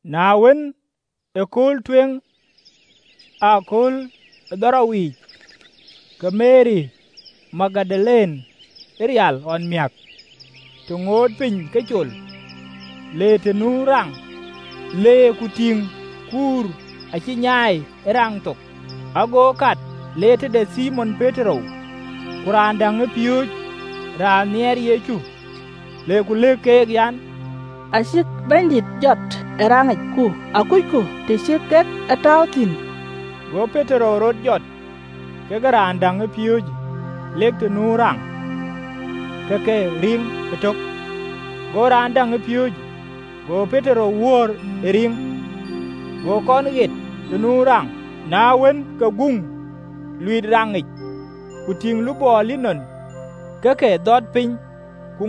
Na wën, ë kööl tueŋ ë akööl kadhorou yiic, ke Meri Magdalene rial ɣɔn amiäk, të ŋootë piny ke col, le të nu raŋ, le ku tïŋ kuur acï nyaai ë raŋ thok. Ago kat, le tëde Thimon Petero, ku raan däŋ ë piööcë, raan nhiɛɛr Yecu, le ku lëk keek an, “Acïk Bɛ̈nydït jɔt ë raŋic, ku akucku të cï kek e tääu thïn?” Go Petero rɔt jɔt, kekë raan däŋ ë piööcë, lek të nu raŋ. Aake riŋ kaarou ëtök, go raan däŋ ë piööcë go Petero wöör ë riŋ, go kɔn ɣet të nu raŋ. Na wën, ke guŋ, luiit raŋic, ku tïŋ lupɔɔ linɔn ke ke dhɔt piny, ku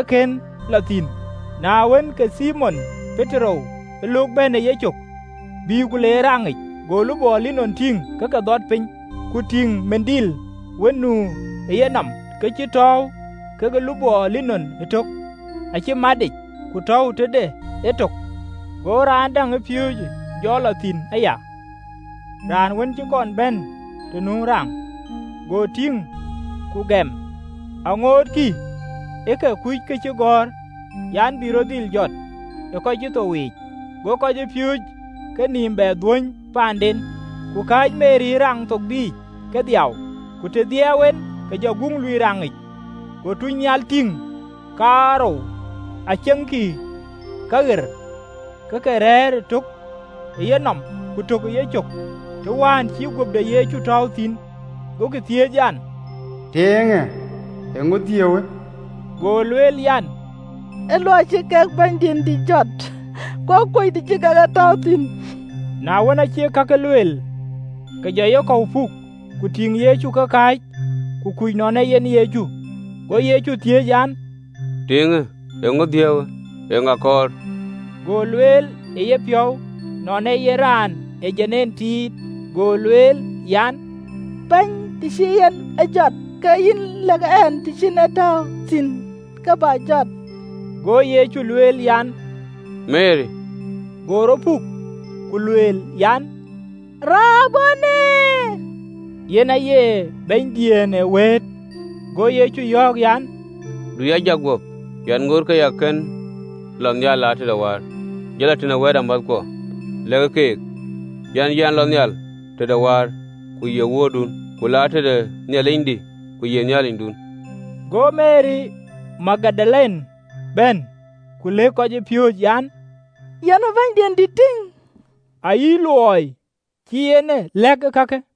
akën lɔ thïn. Na wën, ke Thimon Petero löök bɛ̈n ë yecök, bï ku le ë raŋic, go lupɔɔ linɔn tïŋ ke ke dhɔt piny, ku tïŋ lupɔ wään nu ë yenɔm, ke cïï tɔ̈u kekë lupɔɔ linɔn ëtök, acï matic, ku tɔ̈u tëde etök. Go raan däŋ ë piööcë jɔ lɔ thïn aya, raan wën cï kɔn bɛ̈n të nu raŋ, go tïŋ, ku gɛm. (Aŋootkï ke ke kuc këcïgɔ̈ɔ̈r an, bï rɔt dhil jɔt ë kɔc cï thou yiic.) Go kɔcpiööcë kenïïm bɛ dhuöny paanden. Ku kääc Meri ë raŋ thok biic ke dhiau. Ku të dhiɛɛu en, ke jɔ guŋ luiit raŋic, go tuucnhial tïŋ kaarou, aceŋkï kaɣer, ke ke rɛ̈ɛ̈r, tök ë yenɔm, ku tök ë yecök, të wään cï guöp de Yecu tɔ̈ɔ̈u thïn. Gokï thiëëc an, “Tiiŋë, eeŋö dhiëëuwë?” Go lueel an, “Ee luɔi cï kek Bɛ̈nydït jɔt, ku akuöc të cï kek e tääu thïn!” Na wën, aacï kakë lueel, ke jɔ yekɔ̈u puk, ku tïŋ Yecu ke kääc, ku kuc nɔn ee yen Yecu. Go Yecu thiëëc an, “Tiiŋë eeŋö dhiëëuwë? Eeŋa kɔɔr?” Go lueel ë yepiɔ̈u nɔn ee yen raan ë dom tiit, go lueel an, “Bɛ̈ny, të cï yïn e jɔt, ke yï lëk ɛn të cï yïn e tääu thïn, ke bä jɔt.” Go Yecu lueel an, “Meri!” Go rɔt puk, ku lueel an, “Raboni!” (Yen aye “Bɛ̈nydiën ee wëët.”) Go Yecu yɔ̈ɔ̈k an, “Du ya jak guöp, yɛn ŋoot ke yɛn kën lɔ nhial tëde wäär. Jɔ lɔ tëde wɛ̈ɛ̈tamäthkuɔ, lɛ̈kë keek, an, Yɛn lɔ nhial tëde Wäär, ku ye Wuöördun, ku la tëde Nhialicdï, ku ye Nhialicdun.” Go Meri Magdalene bɛ̈n ku lëk kɔcpiööcë an, yɛn ë Bɛ̈nydït tïŋ, ayï luɔi cï en e lɛ̈k ee kakë.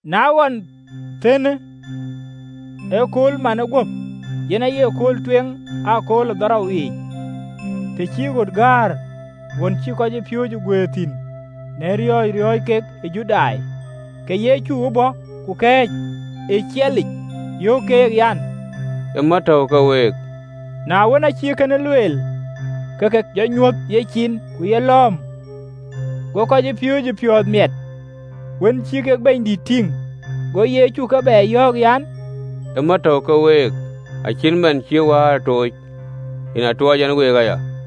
Na ɣɔn thëën, ë köölmanë guöp, yen aye kööl tueŋ ë akööl kadhorou yiic, të cï ɣöt gäär, ɣön cï kɔcpiööcë guëër thïn, në riɔ̈ɔ̈c riɔ̈ɔ̈c kek ë Judai, ke Yecu bɔ̈ ku kɛ̈ɛ̈c ë ciɛɛlic, yöök keek, an, “Ë mät tɔ̈u ke week.” Na wën, aacï kënë lueel, ke ke jɔ nyuöth yecin ku yelɔ̈ɔ̈m. Go kɔcpiööcë piɔ̈ɔ̈th miɛt, wën cï kek Bɛ̈nydït tïŋ. Go Yecu ke bɛ yɔ̈ɔ̈k an, “Ë mät tɔ̈u ke week, cït man cï Wäär a tooc, yen atuɔɔc ɛn week aya.”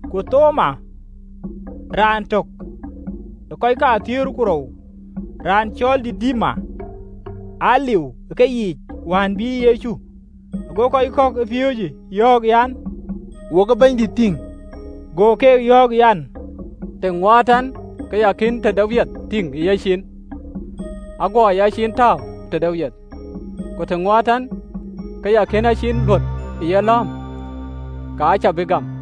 Ku Thoma, raan töŋ ë kɔc thiëër ku rou, raan cɔl Didima, aa liu ë keyiic wään bï Yecu. Ago kɔc kɔ̈k ë piööcë yɔ̈ɔ̈k an, “Wok ë Bɛ̈nydït tïŋ!” Go keek yɔ̈ɔ̈k an, “Të ŋuɔɔt ɛn ke ya kën tëde wiɛth tïŋ ë yecin, aguɔ yaciin tääu tëde wiɛth, ku të ŋuɔɔt ɛn ke ya kën a ciin luöt ë yelɔ̈ɔ̈m, ka cä bï gam.”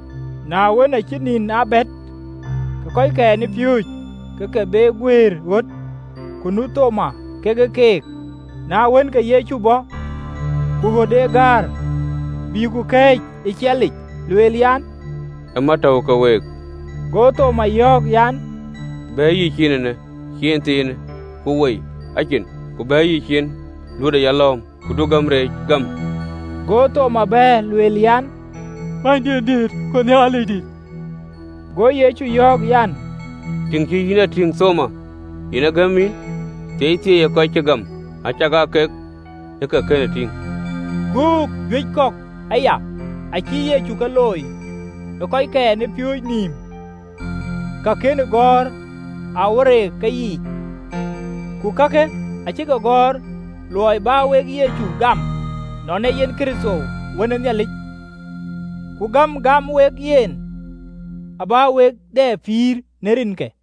Na wën, aacï nïn aa bɛ̈t, ke kɔckɛn ë piööcë ke ke be guëër ɣöt, ku nu Thoma kekë keek. Na wën, ke Yecu bɔ̈, ku ɣöt acï gäär, bïï ku kɛ̈ɛ̈c ë ciɛɛlic, lueel an, “Ë mät tɔ̈u ke week.” Go Thoma yɔ̈ɔ̈k an, “Bɛ̈ɛ̈iyë yïciin eenë, ciin thiinë ku woi a cin, ku bɛ̈ɛ̈iyë yïciin, luötë ë yalɔ̈ɔ̈m: ku du gäm reec, gämë!” Go Thoma bɛ̈ɛ̈r, lueel an, “Bɛ̈nydiëndït, ku Nhialicdï.” Go Yecu yɔ̈ɔ̈k an, “Tïŋ cï yïn a tïŋ, Thoma, yen aa gɛ̈m yïn? Thieithieei ë kɔc cï gam, acakaa kek ë ke kën a tïŋ!” Göök juëc kɔ̈k aya acï Yecu ke looi ë kɔckɛn ë piööcë nïïm, ka kënë gɔ̈ɔ̈r në këcïgɔ̈ɔ̈rë yic. Ku kakë acï ke gɔ̈ɔ̈r në luɔi bä wek Yecu gam, nɔn ee yen Kërtho, Wën ë Nhialic, ku gäm gäm wek, yen abä wek dɛ pïïr në rinke.